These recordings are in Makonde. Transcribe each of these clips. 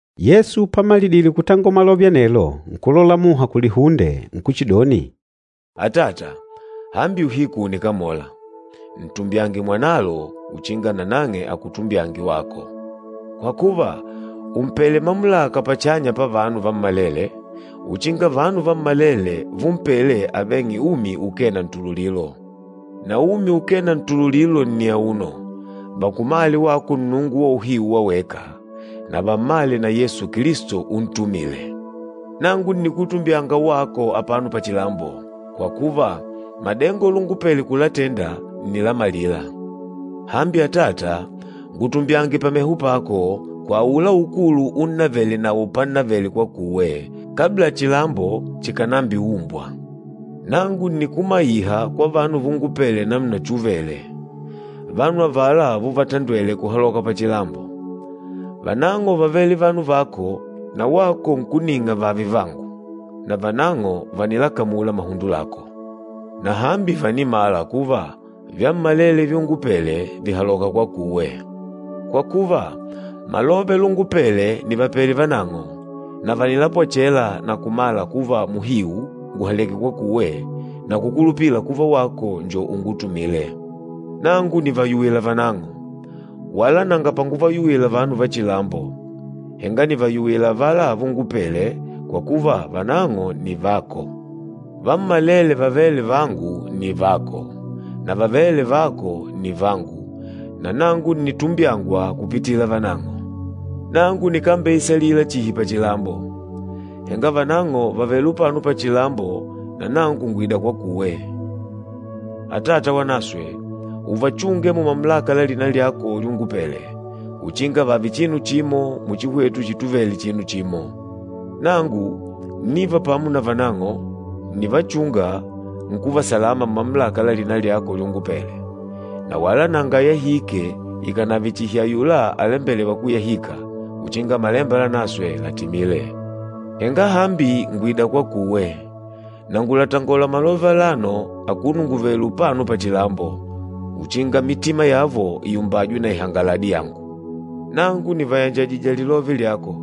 Yesu pamalidile kutangola malove anelo, nkulola muha kulihunde nkuchidoni, “Atata, hambi uhiku ùnikamola. Ntumbyange Mwanalo uchinga nanang'e akutumbyange wako. Kwa kuva, ùmpele mamulaka pachanya pavanu vammalele, uchinga vanu vammalele vumpele aveng'e umi ukee na ntululilo. Na umi ukee na ntululilo nni auno, vakumale wako Nnungu wa uhiu wa weka, na vammale na Yesu Kilisto untumîle. Nangu ǹnikutumbyanga wako apano pachilambo, kwa kuva, madengo lungupele kulatenda ǹnilamalila. Hambi Atata, ngutumbyange pameho pako, kwa aula ukulu unnavele nawo pannavele kwakuwe, kabla chilambo chikànambiumbwa. Nangu ǹnikumaiha kwa vanu vungupele namuna chuvele, vanu avala vuvatandwele kuhaloka pachilambo. Vanang'o vávele vanu vako, na wako nkuning'a vààve vangu, na vanang'o vànilakamula mahundo lako. Na hambi vànimala kuva, vyammalele vyungupele vìhaloka kwakuwe. Kwa kuva, malove lúngupèlè nìvapele vanang'o, na vànilapwechela na kumala kuva muhiu ngùhaleke kwakuwe na kukulupila kuva wako njo ungutumîle. Nangu nìvayuwila vanang'o. Wala nanga panguvayuwila vanu va chilambo, henga nìvayuwila avala vungupele, kwa kuva vanang'o nni vako. Vammalele vavêle vangu nni vako, na vavêle vako nni vangu, na nangu ǹnitumbyangwa kupitila vanang'o. Nangu nikambeisalila chihi pachilambo, henga vanang'o vàvele upano pachilambo na nangu ngwìda kwakuwe. Atata Wanaswe, uvachunge mumamulaka la lina lyako lyungupele, uchinga vààve chinu chimo muchi hwetu chituvele chinu chimo. Nangu ǹniva pamo na vanang'o, ǹnivachunga, nkuva salama mumamulaka la lina lyako lyungupele. Na wala nanga ayahîke, ikànave chihi ayula alembelêwa kuyahika, uchinga Malemba Lanaswe làtimile. Henga hambi ngwìda kwakuwe, na ngulatangola malove alano akuno ngùvele upano pachilambo, uchinga mitima yavo iumbajwe na ihangaladi yangu. Nangu nìvayanjajijije lilove lyako,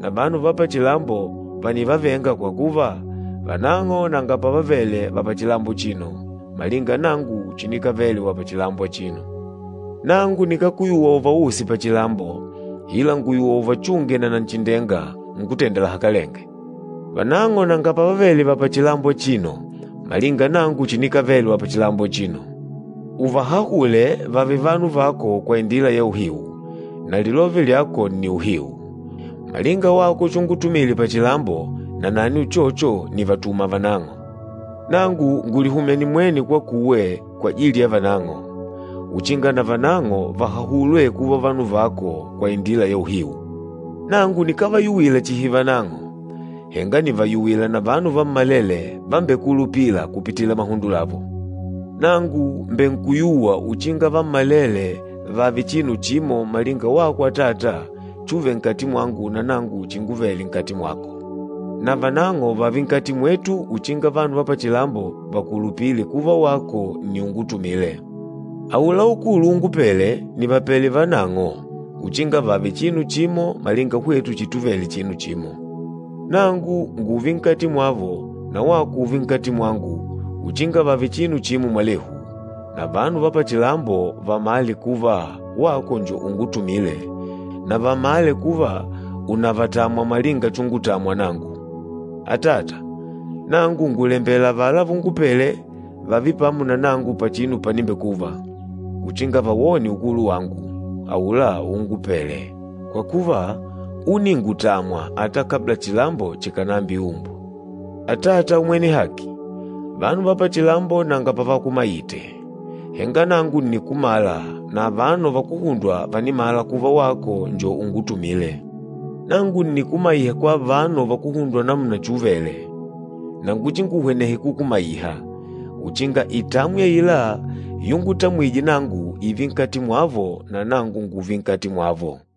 na vanu va pachilambo vànivavenga kwa kuva, vanang'o nanga pavavele va pachilambo achino, malinga nangu chinikavele wa pachilambo achino. Nangu nikákuyuwa uvause pachilambo, ila ngùyuwa uvachunge na Nanchindenga, Nkútenda lahakalenge. Vanang'o nanga pavavele va pachilambo achino, malinga nangu chinikavele wa pachilambo achino. Uvahahule vààve vanu vako kwa indila ya uhiu, na lilove lyako nni uhiu. Malinga wako chungutumile pachilambo, nanani uchocho, nìvatuma vanang'o. Nangu ngùlihumya nimwene kwakuwe kwajili ya vanang'o, uchinga na vanang'o vahahulwe kuva vanu vako kwa indila ya uhiu.” “Nangu nikávayuwila chihi vanang'o, henga nìvayuwila na vanu vammalele vambengukulupîla kupitila mahundo lavo. Nangu mbènkuyuwa uchinga vammalele vààve chinu chimo malinga wako Atata chuve nkati mwangu na nangu chinguvele nkati mwako. Na vanang'o vààve nkati mwetu, uchinga vanu va pachilambo vakulupile kuva wako nni ungutumîle. Aula ukulu ungupêle, nìvapele vanang'o, uchinga vààve chinu chimo malinga hwetu chituvele chinu chimo. Nangu ngùùve nkati mwavo na wako ùùve nkati mwangu, uchinga vààve chinu chimo mwalehu, na vanu va pachilambo vamàle kuva wako njo ungutumîle, na vamale kuva ùnavatamwa malinga chungutamwa nangu. Atata, nangu ngùlembela avala vungupele vààve pamo na nangu pachinu panimbekuva, uchinga vawone ukulu wangu, aula úngupèlè, kwa kuva, úningutamwa ata kabla chilambo chikànambiumbwa. Atata Umwene Haki, vanu va pachilambo nanga pavakumaite, henga nangu ǹnikumala, na avano vakuhundwa vànimala kuva wako njo ungutumîle. Nangu ǹnikumaiha kwa avano vakuhundwa namuna chuvele, na nguchinguhwenehe kukumaiha, uchinga itamwi aila yungutamwije nangu ììve nkati mwavo na nangu ngùùve nkati mwavo.”